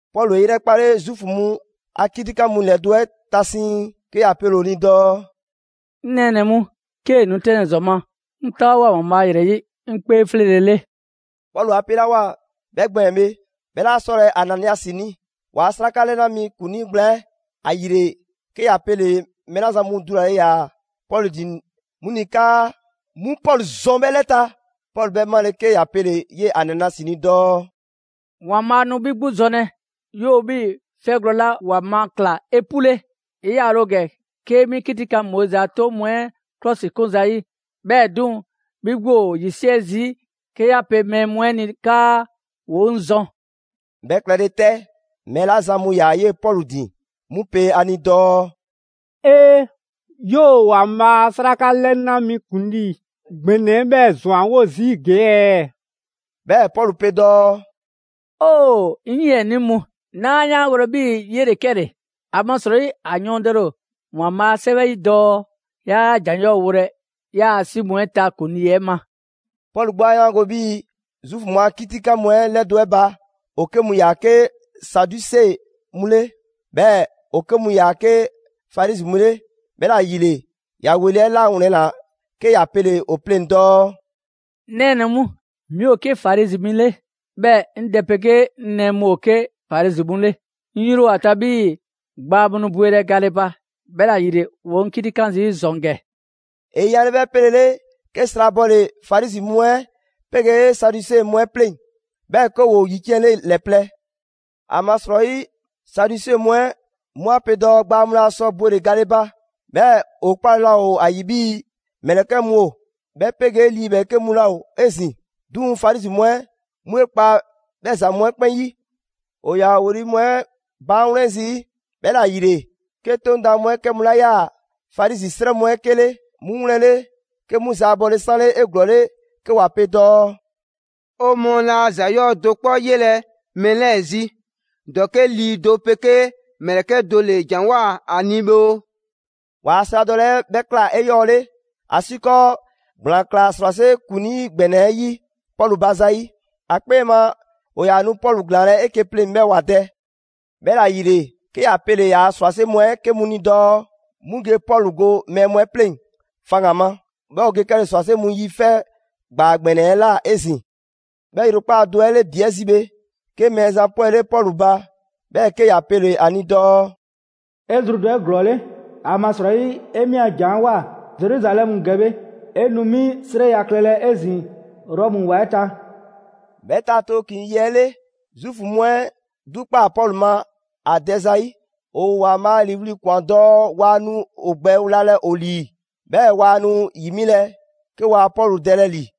Pɔlu 'e 'yrɛkpale Zuufu mu a 'kitikan mu ‑lɛdo' 'ɛ ta siiŋ, 'ke ‑ya pele‑ ‑o ni dɔɔ: «'Ŋ nɛɛnɛ‑ mu, 'kee‑ nu 'tɛnlɛ‑ ‑zɔn ma, 'ŋ 'taawoa꞊ ‑Waanbhaa' ‑yrɛ 'yi 'ŋ 'kpee 'fleele‑ 'le.» Pɔlu 'a 'pelawoa 'bhɛ gbɛɛn‑ bhe, 'bhɛ 'laa 'sɔlɛ‑ Ananiasi ni, ‑waa' 'sraka 'lɛna mi ‑kuŋlii gblaan 'ɛ. ‑Ayile 'ke ‑ya pele mɛɛ 'la zan mu dulale ‑yaa Pɔlu ‑din 'mu ni 'kaa 'mu Pɔlu zɔn 'bhɛ 'lɛ ta. Pɔlu 'bhɛ 'male‑ 'ke ‑ya pele‑ 'yee‑ Ananiasi ni dɔɔ: «‑Waanbhaa' nu 'bhi 'gbu zɔnlɛ, 'yoo‑ 'bhii‑ 'fɛgwlɛ‑ 'la ‑wa ma ꞊kla 'epule! 'E 'yaale‑ ‑o ‑gɛ 'kee‑ 'mi 'kitikan Moizi 'a 'toŋ mu 'ɛ 'klɔsikun zayi'. 'Bhɛɛ‑ 'duŋ‑, 'bhi 'gbu ‑o ‑yisiɛ' zii' 'ke 'ya pe mɛɛ mu 'ɛ ni 'kaa ‑woo 'ŋ zɔn.» 'Bhɛ klɛle 'tɛ, mɛɛ 'la zan mu ‑yaa 'yee‑ Pɔlu ‑din, 'mu pe ‑a ni dɔɔ: «'E! 'Yoo‑ ‑Waanbhaa' a 'sraka 'lɛna mi ‑kuŋlii ‑gbɛnɛ 'ɛ 'bhɛɛ‑ ‑zwanwo' zii' ‑gee' ɛɛ?» 'Bhɛɛ‑ Pɔlu pe dɔɔ: «'Ŋ 'yiɛnii mu, 'naa 'yaangolɛ 'bhii‑ 'yele‑ 'kɛle‑. ‑Amasrɔyi ‑a yɔɔndɛle ‑o ‑Waanbhaa' a 'Sɛwɛ 'yi dɔɔ: ‹'Yaa ‑jan 'yɔɔ‑ wolɛ 'yaa‑ 'si mu 'ɛ ta ‑kuŋlii 'ɛ ma.›» Pɔlu 'gbu 'yaa‑ 'yaango‑ 'bhii‑ Zuufu mu a 'kitikan mu 'ɛ ‑lɛdo' 'ɛ ba, ‑o 'ke mu ‑yaa 'ke Saduse mu 'le, 'bhɛɛ‑ ‑o 'ke mu ‑yaa 'ke Farizi mu 'le. 'Bhɛla‑ ‑yile ‑ya ‑weli' 'ɛ 'lawlɛnna 'ke ‑ya pele‑ ‑o pleŋ‑ dɔɔ: «'Ŋ nɛɛnɛ‑ mu, 'mi ‑o 'ke Farizi mi 'le, 'bhɛɛ‑ 'ŋ dɛ 'pegee 'ŋ nɛɛ mu ‑o 'ke Farizi mu 'le. 'Ŋ 'yri ‑o ‑a ta 'bhii‑ gbaa mu nu bwelɛ gale ba, 'bhɛla‑ ‑yile ‑woo 'ŋ 'kitikan zii' ‑zɔn ‑gɛ.» ‑E yanle 'bhɛ 'pelele, 'ke sra bɔle‑ Farizi mu 'ɛ 'pegee Saduse mu 'ɛ 'pleŋ‑, 'bhɛɛ‑ 'ke ‑woo ‑yiciɛnle ‑lɛ plɛ. ‑Amasrɔyi Saduse mu 'ɛ 'mu 'a pe dɔɔ gbaa mu laa sɔ bwele‑ gale ba, 'bhɛɛ‑ ‑o 'kpale‑ laa ‑o ‑a ‑yi 'bhii‑ ‑mlɛkɛ' mu ‑o, 'bhɛ 'pegee lii ‑bhɛɛke' mu laa ‑o 'ezin‑. 'Duŋ‑ Farizi mu 'ɛ 'mu 'e 'kpa 'bhɛ ‑za mu 'ɛ 'kpɛn 'yi. ‑O ‑yaa ‑o ‑weli' mu 'ɛ baan' 'wlɛn zii', 'bhɛla‑ ‑yile 'ke 'Toŋ daan mu 'ɛ 'kɛ mu 'la 'yaa‑ Farizi 'srɛ mu 'ɛ 'kele, 'mu 'wlɛnle‑ 'ke 'mu zaabɔle 'sanle 'eglɔɔle 'ke ‑wa pe dɔɔ: «'O mɔɔ laa ‑za 'yɔɔ‑ do 'kpɔ 'yelɛ‑ mɛɛ 'lɛɛ‑ zi; ‑dɔke' lii do 'pegee ‑mlɛkɛ' do ‑le ‑janwoa ‑a ni bhe oo!» ‑Waa' sradɔle 'ɛ 'bhɛ ꞊kla 'eyɔɔle, ‑asiikɔɔ ‑gblaan ꞊klaa ‑srwase' ‑kuŋlii ‑gbɛnɛ 'ɛ 'yi Pɔlu ba zayi': ‑a 'kpee ma ‑o ‑yaa nu Pɔlu ‑glaanlɛ' 'eke‑ pleŋ‑ 'bhɛɛ‑ ‑wa dɛ. 'Bhɛla‑ ‑yile 'ke ‑ya pele‑ ‑yaa' ‑srwase' mu 'ɛ 'ke mu ni dɔɔ 'mu ge Pɔlu go mɛɛ mu 'ɛ 'pleŋ‑ faŋgan‑ ma, 'bhɛɛ‑ ‑o ge 'kɛle‑ ‑srwase' mu yi 'fɛ ‑gbaa ‑gbɛnɛ 'ɛ ꞊la 'ezin‑. 'Bhɛ ‑yrekpaa' do 'ɛ 'le ‑bi 'ɛ zi bhe, 'ke Mɛɛzan 'pwɛle Pɔlu ba, 'bhɛɛ‑ 'ke ‑ya pele‑ ‑a ni dɔɔ: «'E zru dɔ 'eglɔɔle! ‑Amasrɔyi 'e 'mi a janwoa‑ Zeruzalɛmu ‑gɛ bhe, 'e nu 'mi 'srɛya‑ klɛlɛ 'ezin‑ Rɔmu ‑wa 'ɛ ta.» 'Bhɛ ta tooklin‑ yi 'ɛ 'le, Zuufu mu 'ɛ 'dukpaa‑ Pɔlu ma ‑a dɛ zayi': ‑o ‑Waanbhaa' ‑liiwli' ‑kwan dɔɔ waa nu ‑o gbɛ wlalɛ ‑o ‑lii, 'bhɛɛ‑ waa nu ‑yi 'milɛ‑, 'ke waa Pɔlu dɛlɛ ‑li.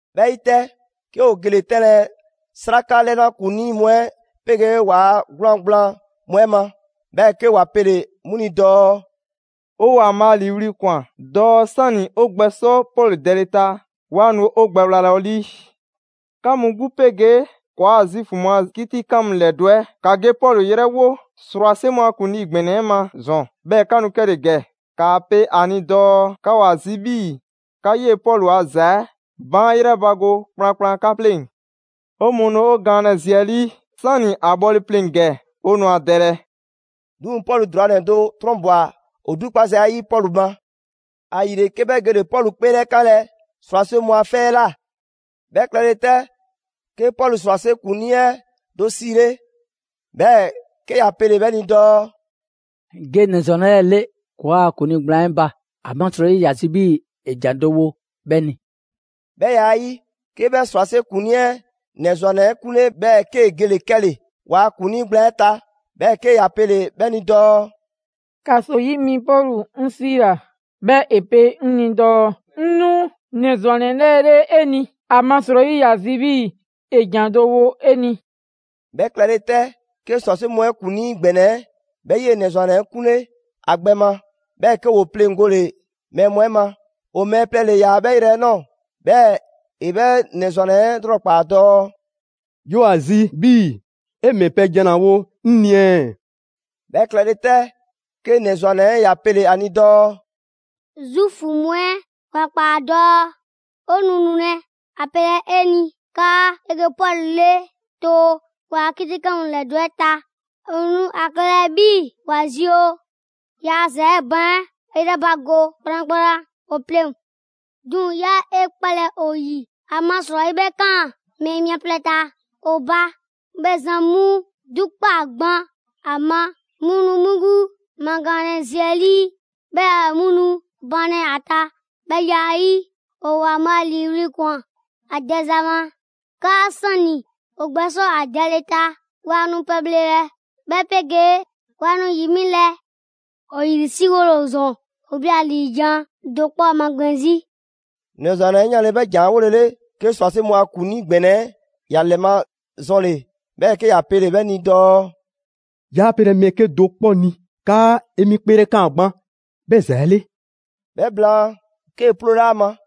'Bhɛ 'yi 'tɛ, 'ke ‑o gele‑ 'tɛnlɛ‑ 'Sraka 'lɛna ‑kuŋlii mu 'ɛ 'pegee ‑waa' 'gwlaan‑ gblaan mu 'ɛ ma, 'bhɛɛ‑ 'ke ‑wa pele‑ 'mu ni dɔɔ: «'O ‑Waanbhaa' ‑liiwli' ‑kwan dɔɔ 'sani 'o gbɛ sɔ Pɔlu dɛle ta, 'waa nu 'o gbɛ wlalɛ 'o 'lii. 'Ka mu 'gbu 'pegee ‑kɔɔa' Zuufu mu a 'kitikan mu ‑lɛdo' 'ɛ, ‑ka ge Pɔlu 'yrɛwo ‑srwase' mu a ‑kuŋlii ‑gbɛnɛ 'ɛ ma ‑zɔn 'bhɛɛ‑ 'ka nu 'kɛle‑ ‑gɛ. ‑Kaa pe a ni dɔɔ 'ka ‑o ‑a zi 'bhii‑ 'ka 'yee‑ Pɔlu ‑a ‑za 'ɛ baan' 'yrɛbago kplankplan 'ka 'pleŋ. 'O mɔɔ nu 'o gaanlɛ zi 'ɛ 'lii, 'sani‑ ‑a bhɔle pleŋ‑ ‑gɛ, 'o nu ‑a dɛlɛ.» 'Duŋ‑ Pɔlu ‑drwanɛ do 'trɔnbwa‑ ‑o 'dukpa za 'ɛ 'yi Pɔlu ma. ‑Ayile, 'ke 'bhɛ gele‑ Pɔlu 'kpeelɛkanlɛ ‑srwase' mu a 'fɛ 'ɛ ꞊la. 'Bhɛ klɛle 'tɛ, 'ke Pɔlu ‑srwase' ‑kuŋlii 'ɛ do 'siile, 'bhɛɛ‑ 'ke ‑ya pele‑ 'bhɛ ni dɔɔ: «Ge ‑nɛ ‑zwannɛ 'lɛɛ‑ 'le ‑kɔɔa' ‑kuŋlii gblaan 'ɛ ba, ‑amasrɔyi ‑ya zi 'bhii‑ ‑e ‑jan do wo 'bhɛ ni.» 'Bhɛ ya 'ɛ 'yi, 'ke 'bhɛ ‑srwase' ‑kuŋlii 'ɛ ‑nɛ ‑zwannɛ 'ɛ 'kunle, 'bhɛɛ‑ 'kee‑ gele‑ 'kɛle‑ ‑waa' ‑kuŋlii gblaan 'ɛ ta; 'bhɛɛ‑ 'ke ‑ya pele‑ 'bhɛ ni dɔɔ: «‑Kaso 'yi mi Pɔlu 'ŋ 'siila‑, 'bhɛɛ‑ ‑e pe 'ŋ ni dɔɔ 'ŋ 'nu ‑nɛ ‑zwannɛ 'lɛɛ‑ 'le 'e ni, ‑amasrɔyi ‑ya zi 'bhii‑ ‑e ‑jan do wo 'e ni.» 'Bhɛ klɛle 'tɛ, 'ke ‑srwase' mu 'ɛ ‑kuŋlii ‑gbɛnɛ 'ɛ 'bhɛ 'yee‑ ‑nɛ ‑zwannɛ 'ɛ 'kunle ‑a gbɛ ma, 'bhɛɛ‑ 'ke ‑woo 'pleŋgole mɛɛ mu 'ɛ ma; ‑o mɛɛ plɛ ‑le ‑yaa 'bhɛ yrɛ 'ɛ ꞊nɔɔ. 'Bhɛɛ‑ ‑e 'bhɛ ‑nɛ ‑zwannɛ 'ɛ 'lrɔkpaa‑ dɔɔ: «'Yoo‑ ‑a zi 'bhii‑ 'e ‑mɛ pɛ jan ‑la wo 'ŋ ni ɛɛ?» 'Bhɛ klɛle 'tɛ, 'ke ‑nɛ ‑zwannɛ 'ɛ ‑ya pele‑ ‑a ni dɔɔ: «Zuufu mu 'ɛ ‑wa ꞊kpaa dɔɔ ‑o nu nulɛ ‑a pelɛ 'e ni 'kaa 'e ge Pɔlu 'le too ‑waa' 'kitikan mu ‑lɛdo' 'ɛ ta. ‑O nu ‑a klɛlɛ 'bhii‑ ‑wa zi ‑o ‑yaa ‑za 'ɛ baan' 'yrɛbago kplankplan ‑o 'pleŋ‑. 'Duŋ‑ 'yaa 'e 'kpalɛ‑ ‑o ‑yi! ‑Amasrɔyi 'bhɛ kan mɛɛ mia plɛ ta ‑o ba, 'bhɛ zan mu 'dukpaa‑ gban ‑a ma, 'mu nu 'mu 'gbu magaanlɛ zi 'ɛ 'lii, 'bhɛɛ‑ 'mu nu banlɛ ‑a ta. 'Bhɛ ya 'ɛ 'yi, ‑o ‑Waanbhaa' ‑liiwli' ‑kwan ‑a dɛza ma 'kaa 'sani‑ ‑o gbɛsɔ ‑a dɛle ta, waa nu pɛbhlelɛ 'bhɛ 'pegee waa nu ‑yi 'milɛ‑. ‑O ‑yrisriwole ‑o ‑zɔn, ‑woo 'bhi ‑la 'liijan‑ do 'kpɔ 'ɛ magbɛn 'zi.» ‑Nɛ ‑zwannɛ 'ɛ 'yanle‑ 'bhɛ ‑jan 'ɛ 'wolele, 'ke ‑srwase' mu a ‑kuŋlii ‑gbɛnɛ 'ɛ ‑ya ‑lɛmazɔnle, 'bhɛɛ‑ 'ke ‑ya pele‑ 'bhɛ ni dɔɔ: «'Yaa pelɛ mɛɛ 'kedo‑ 'kpɔ ni 'kaa 'e 'mi 'kpeelɛkaan gban 'bhɛ ‑za 'ɛ 'le.» 'Bhɛ blaan, 'kee‑ 'ploole ‑a ma.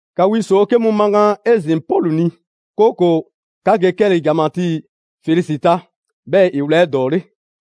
‑Ka wi ‑soo' 'ke mu magaan 'ezin‑ Pɔlu ni, 'kooko‑ 'ka ge 'kɛle‑ ‑janmatii Felisi ta, 'bhɛɛ‑ ‑e wla 'edɔɔle.»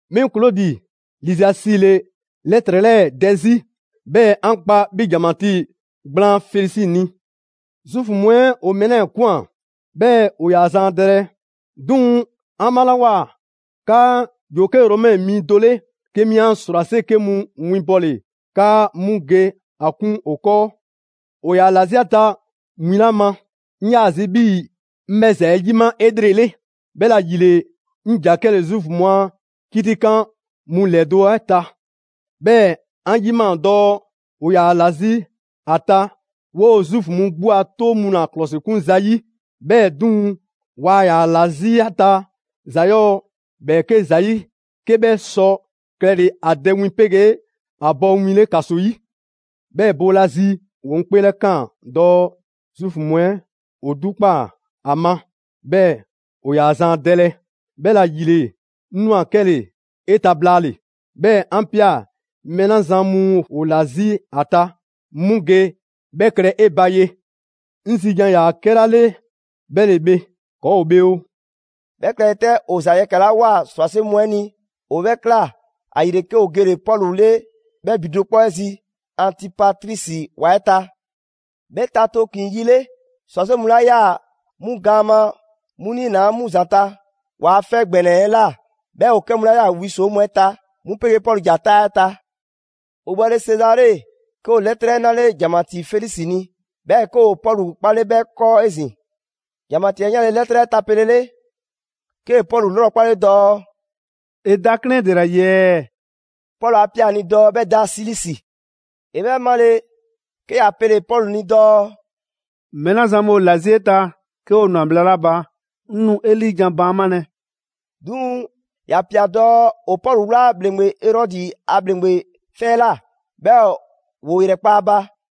«'Mi Klodi Liziasi ‑le 'lɛtrɛ 'lɛɛ‑ dɛ 'zi, 'bhɛɛ‑ 'an kpa 'bhi ‑janmatii gblaan Felisi ni. «Zuufu mu 'ɛ ‑o mɛɛ 'lɛɛ‑ ꞊kwan, 'bhɛɛ‑ ‑o ‑yaa zan ‑a dɛlɛ. 'Duŋ‑ 'an 'malawoa 'kaa ‑yoo 'ke Romɛ mi do 'le, 'ke 'mi 'an ‑srwase' 'ke mu winbɔle 'kaa 'mu ge ‑a 'kun ‑o 'kɔɔ. ‑O ‑yaa ‑la 'zi ‑a ta win 'la ma, 'ŋ 'yaa‑ zi 'bhii‑ 'ŋ 'bhɛ ‑za 'ɛ 'yima 'elrele; 'bhɛla‑ ‑yile 'ŋ ‑ja 'kɛle‑ Zuufu mu a 'kitikan mu ‑lɛdo' 'ɛ ta. 'Bhɛɛ‑ 'an 'yimaa‑ dɔɔ ‑o ‑yaa ‑la 'zi ‑a ta 'woo‑ Zuufu mu 'gbu a 'toŋ mu ‑la ‑klɔsikun zayi'. 'Bhɛɛ‑ 'duŋ‑, waa ‑yaa ‑la 'zi ‑a ta ‑za 'yɔɔ‑ ‑bhɛɛke' ‑zayi' 'ke 'bhɛ ‑sɔ klɛle ‑a dɛ win 'pegee ‑a bɔ win 'le ‑kaso 'yi. 'Bhɛɛ‑ boolazi, ‑woo 'ŋ 'kpeelɛkaan dɔɔ Zuufu mu 'ɛ ‑o 'dukpaa‑ ‑a ma 'bhɛɛ‑ ‑o ‑yaa zan ‑a dɛlɛ, 'bhɛla‑ ‑yile 'ŋ ꞊nwa 'kɛle‑ 'e ta blaale‑; 'bhɛɛ‑ 'an ꞊pia mɛɛ 'la zan mu ‑o ‑la 'zi ‑a ta, 'mu ge 'bhɛ klɛ 'e ba ye. 'Ŋ zi jan ‑yaa 'kɛla 'le 'bhɛ ‑le bhe, ‑kɔɔ' ‑o bhe oo!» 'Bhɛ klɛle 'tɛ, ‑o ‑za yɛkɛ‑ 'la ꞊woa ‑srwase' mu 'ɛ ni, ‑o 'bhɛɛ‑ ꞊kla; ‑ayile 'ke ‑o gele‑ Pɔlu 'le 'bhɛ ‑bi do 'kpɔ 'ɛ zi Antipatrisi ‑wa 'ɛ ta. 'Bhɛ ta tooklin‑ yi 'le, ‑srwase' mu 'la 'yaa‑ 'mu gaan ma, 'mu niinaa' 'mu ‑zanta' ‑waa' 'fɛ ‑gbɛnɛ 'ɛ ꞊la; 'bhɛɛ‑ ‑o 'kɛ mu 'la 'yaa‑ wi ‑soo' mu 'ɛ ta, 'mu 'pegee Pɔlu ‑ja 'taa 'ɛ ta. ‑O bhɔle Sezare, 'ke ‑o 'lɛtrɛ 'ɛ 'nale ‑janmatii Felisi ni, 'bhɛɛ‑ 'ke ‑o Pɔlu 'kpale 'bhɛ 'kɔɔ 'ezin‑. ‑Janmatii 'ɛ 'yanle‑ 'lɛtrɛ 'ɛ tapelele, 'kee‑ Pɔlu 'lrɔkpale dɔɔ: «'E da 'klɛɛn 'ɛ ‑dela ‑yi ɛɛ?» Pɔlu 'a ꞊pia ‑a ni dɔɔ 'bhɛ da Silisi. ‑E 'bhɛ 'male, 'ke ‑ya pele‑ Pɔlu ni dɔɔ: «Mɛɛ 'la zan mu ‑o ‑la 'zi 'e ta, 'ke ‑o ꞊nwa bhla 'la ba, 'ŋ nu 'e 'liijan‑ baanmalɛ.» 'Duŋ‑ ‑ya ꞊pia dɔɔ ‑o Pɔlu 'wla ‑bhleŋgbe Erɔdi a ‑bhleŋgbe 'fɛ 'ɛ ꞊la, 'bhɛɛ‑ ‑woo ‑yrɛkpa' ‑a ba.